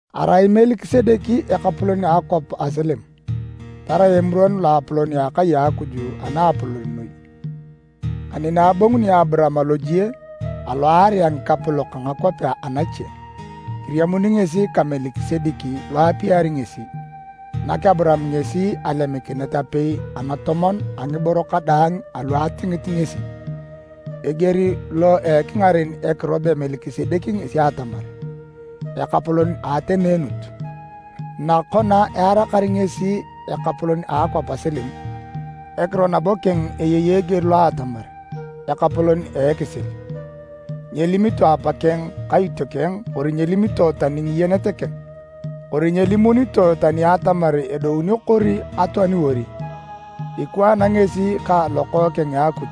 Arai Melikisedek ekapolon a akwap a Salem, tarai Emuron Loapolon a akai a Akuj Anaapolon Noi. Ani na abongunio Aburaam alojie alo aarea ngikapolok a ngakwapea anache, kiriamuni ngesi ka Melikisedek lo apiari ngesi nak Aburaam ngesi alemikinet apei anatomon a ngiboro kadaang alu atingit ngesi. (Eger lo ekingaren a ekiro be Melikisedek ngesi atamar “Ekapolon a ateneanut” na kona araakar ngesi ekapolon a akwap a Salem, ekiro nabo keng eyei eger lo atamar, “Ekapolon a Ekisil”.) Nyelimitoe apakeng ka itiokeng kori nyelimitoe tani ngiyenet keng, kori nyelimunitoe tani atamar edounio kori atoani wori. Ikwaan ngesi ka Lokookeng a Akuj,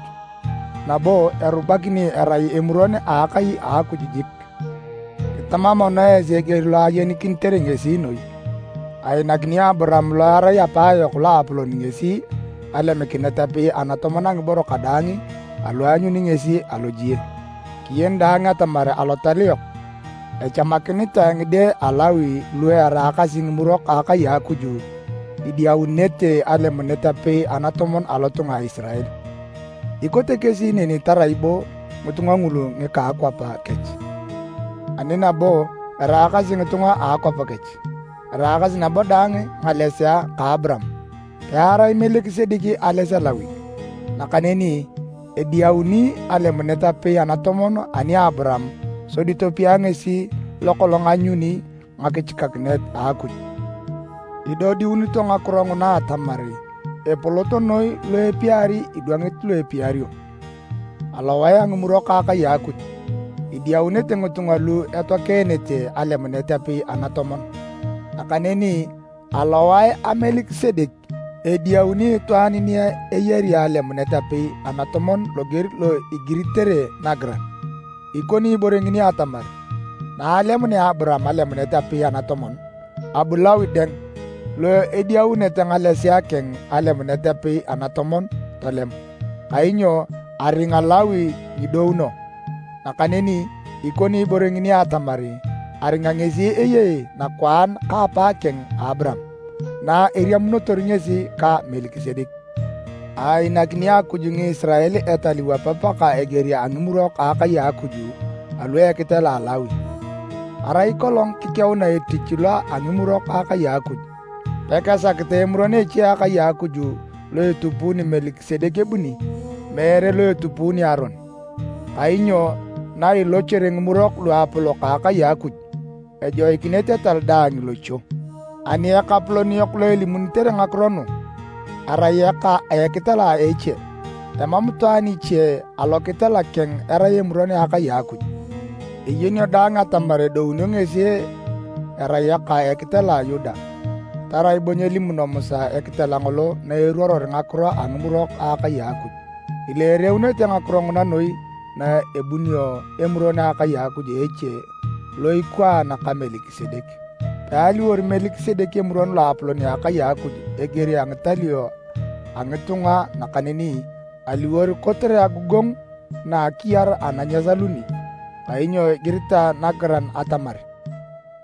nabo erubakini erai emuron a akai a Akuj jik. Kitama mono esi eger lo ayenikinitere ngesi noi. Ainakini Aburaam lo erai apaayok loapolon ngesi alemikinet apei anatomon a ngiboro kadaang alu aanyuni ngesi alojie. Kiyen dang atamar Alotal yok, echamakinit ngide a Lawi lu eraakasi ngimurok a akai a Akuj idiaunete alemunet apei anatomon alotunga a Isirael. Ikote kesi neni tarai bo ngitunga ngulu ngika a akwap kech. Ani nabo eraakasi ngitunga a akwap kech, eraakasi nabo dang ngalesea ka Aburaam. Pearai Melikisedek ales a Lawi, nakaneni ediauni alemunet apei anatomon ani a Aburaam sodi topia ngesi lo kolong aanyuni ngakichikakinet a Akuj. Idodiunito ngakiro nguna atamar epolot noi lo epiari idwangit lo epiario. Alowae a ngimurok a akai a Akuj, idiaunete ngitunga lu etoakeenete alemunet apei anatomon, nakaneni alowae a Melikisedek, ediauni itwaan ni eyari alemunet apei anatomon loger lo igiritere nagiran. Ikoni ibore ngini atamar, na alemunea Aburaam alemunet apei anatomon, abu Lawi dang (lo idiaunete ngalesea keng alemunet apei anatomon) tolem. Kainyo aringa Lawi nyidouno, nakaneni ikoni ibore ngini atamar aringa ngesi eyei nakwaan ka apaakeng Aburaam na eriamunotor ngesi ka Melikisedek. Ainakini Akuj Ngisirael etal iwapap ka eger a ngimurok a akai a Akuj alu a ekitela a Lawi. Arai kolong kikiuna etich lo a ngimurok a akai a Akuj, pakesakitae emuron eche a akai a Akuj lo etupuuni Melikisedek ebuni, meere lo etupuuni Aron. Kainyo na ilochere Ngimurok Luapolok a akai a Akuj, ejoikinit etal dang ilochio. Ani Ekapolon yok lo elimunitere ngakiro nu, arai eka a ekitela a eche, emam itwaan iche alokitela keng arai emuron a akai a Akuj. Eyenio daang atamar edounio ngesi erai eka a ekitela a Yuda, tarai bo nyelimuno Musa ekitela ngolo na eruoror ngakiro a ngimurok a akai a Akuj. Ileereunete ngakiro nguna noi na ebunio emuron a Akai a Akuj eche lo ikwaan ka Melikisedek. Pealiwor Melikisedek Emuron Loapolon a akai a Akuj a eger a ngitalio a ngitunga nakaneni aliwor kotere agogongu na akiyar ana nyesaluni. Kainyo igiritae nagiran atamar,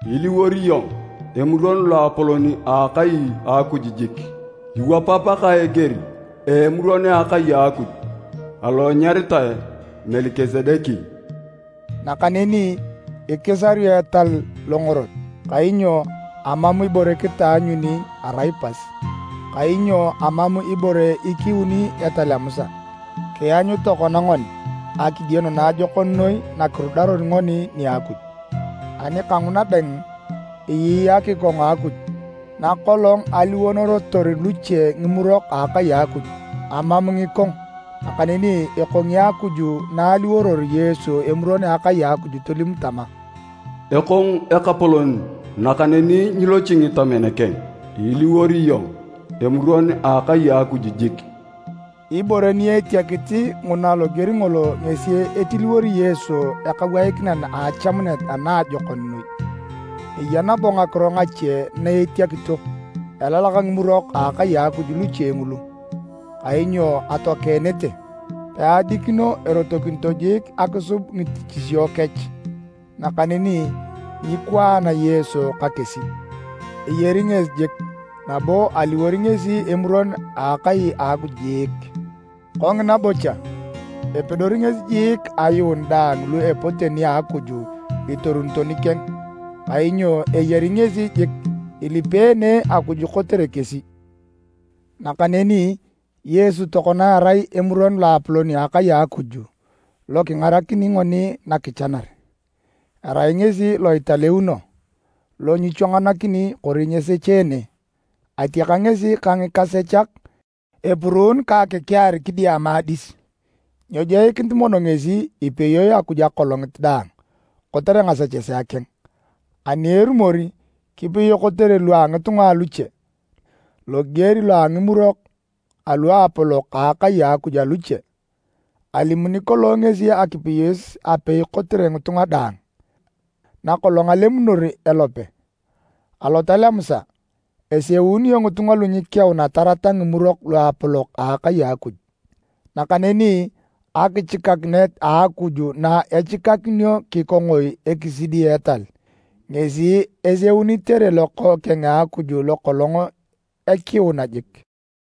“Iliwor iyong emuron loapolon a akai a Akuj jik, iwapap ka eger a emuron a akai a Akuj alo enyaritae Melikisedek.” Nakaneni ikisario etal longorot, kainyo amam ibore kitaanyuni arai pas. Kainyo amam ibore ikiuni etal a Musa. Kianyu tokona ngoni akigieno naajokon noi nakirudunor ngoni nia a Akuj. Ani kanguna dang, eyei akikong a Akuj. Nakolong aliwonorotor luche ngimurok a akai a Akuj, amam ngikong. Nakaneni ekongi Akuj na aliworor Yesu emuron a akai a Akuj tolim tama, “Ekong Ekapolon nakaneni nyilochi ngitamen keng, ‘Iliwor iyong emuron a akai a Akuj jik.’” Ibore ni etiakit nguna loger ngolo ngesi etiliwo Yesu ekaweikinan a achamunet anaajokon noi. Eya nabo ngakiro ngache na etiakito, alalak ngimurok a akai a Akuj luche ngulu, kainyo atoakeenete, peadikino erotokinito jiik akisub ngitichisio kech. Nakaneni nyikwaan Yesu ka kesi, eyari ngesi jik nabo aliwor ngesi emuron a akai a Akuj jiik. Kongina bocha, epedori ngesi jiik ayuun daang lu epote nia Akuj itorunito nikeng, kainyo eyari ngesi jik ilipeene Akuj kotere kesi. Nakaneni Yesu tokona erai Emuron Loapolon a akai a Akuj lokingarakini ngoni nakichanar. Erai ngesi lo italeuno, lo nyichwanganakini kori nyesecheene, atiak ngesi ka ngikasechak epuruun ka akikear kidiama adis. Nyejoikinit mono ngesi ipeyoe Akuj akolongit daang kotere ngasechesea keng ani erumor kipeye kotere lu a ngitunga aluche, loger lo a Ngimurok Aluapolok a akai a Akuj aluche. Alemuni kolong ngesi akipeyos apei kotere ngitunga daang, nakolong alemunor elope. Alotal a Musa, eseunio ngitunga lu nyikiuna tarata ngimurok luapolok a akai a Akuj. Nakaneni akichikakinet a Akuj na echikakinio kikongoi ekisidi a etal, ngesi eseunitere Lokookeng a Akuj lo kolong ekiuna jik.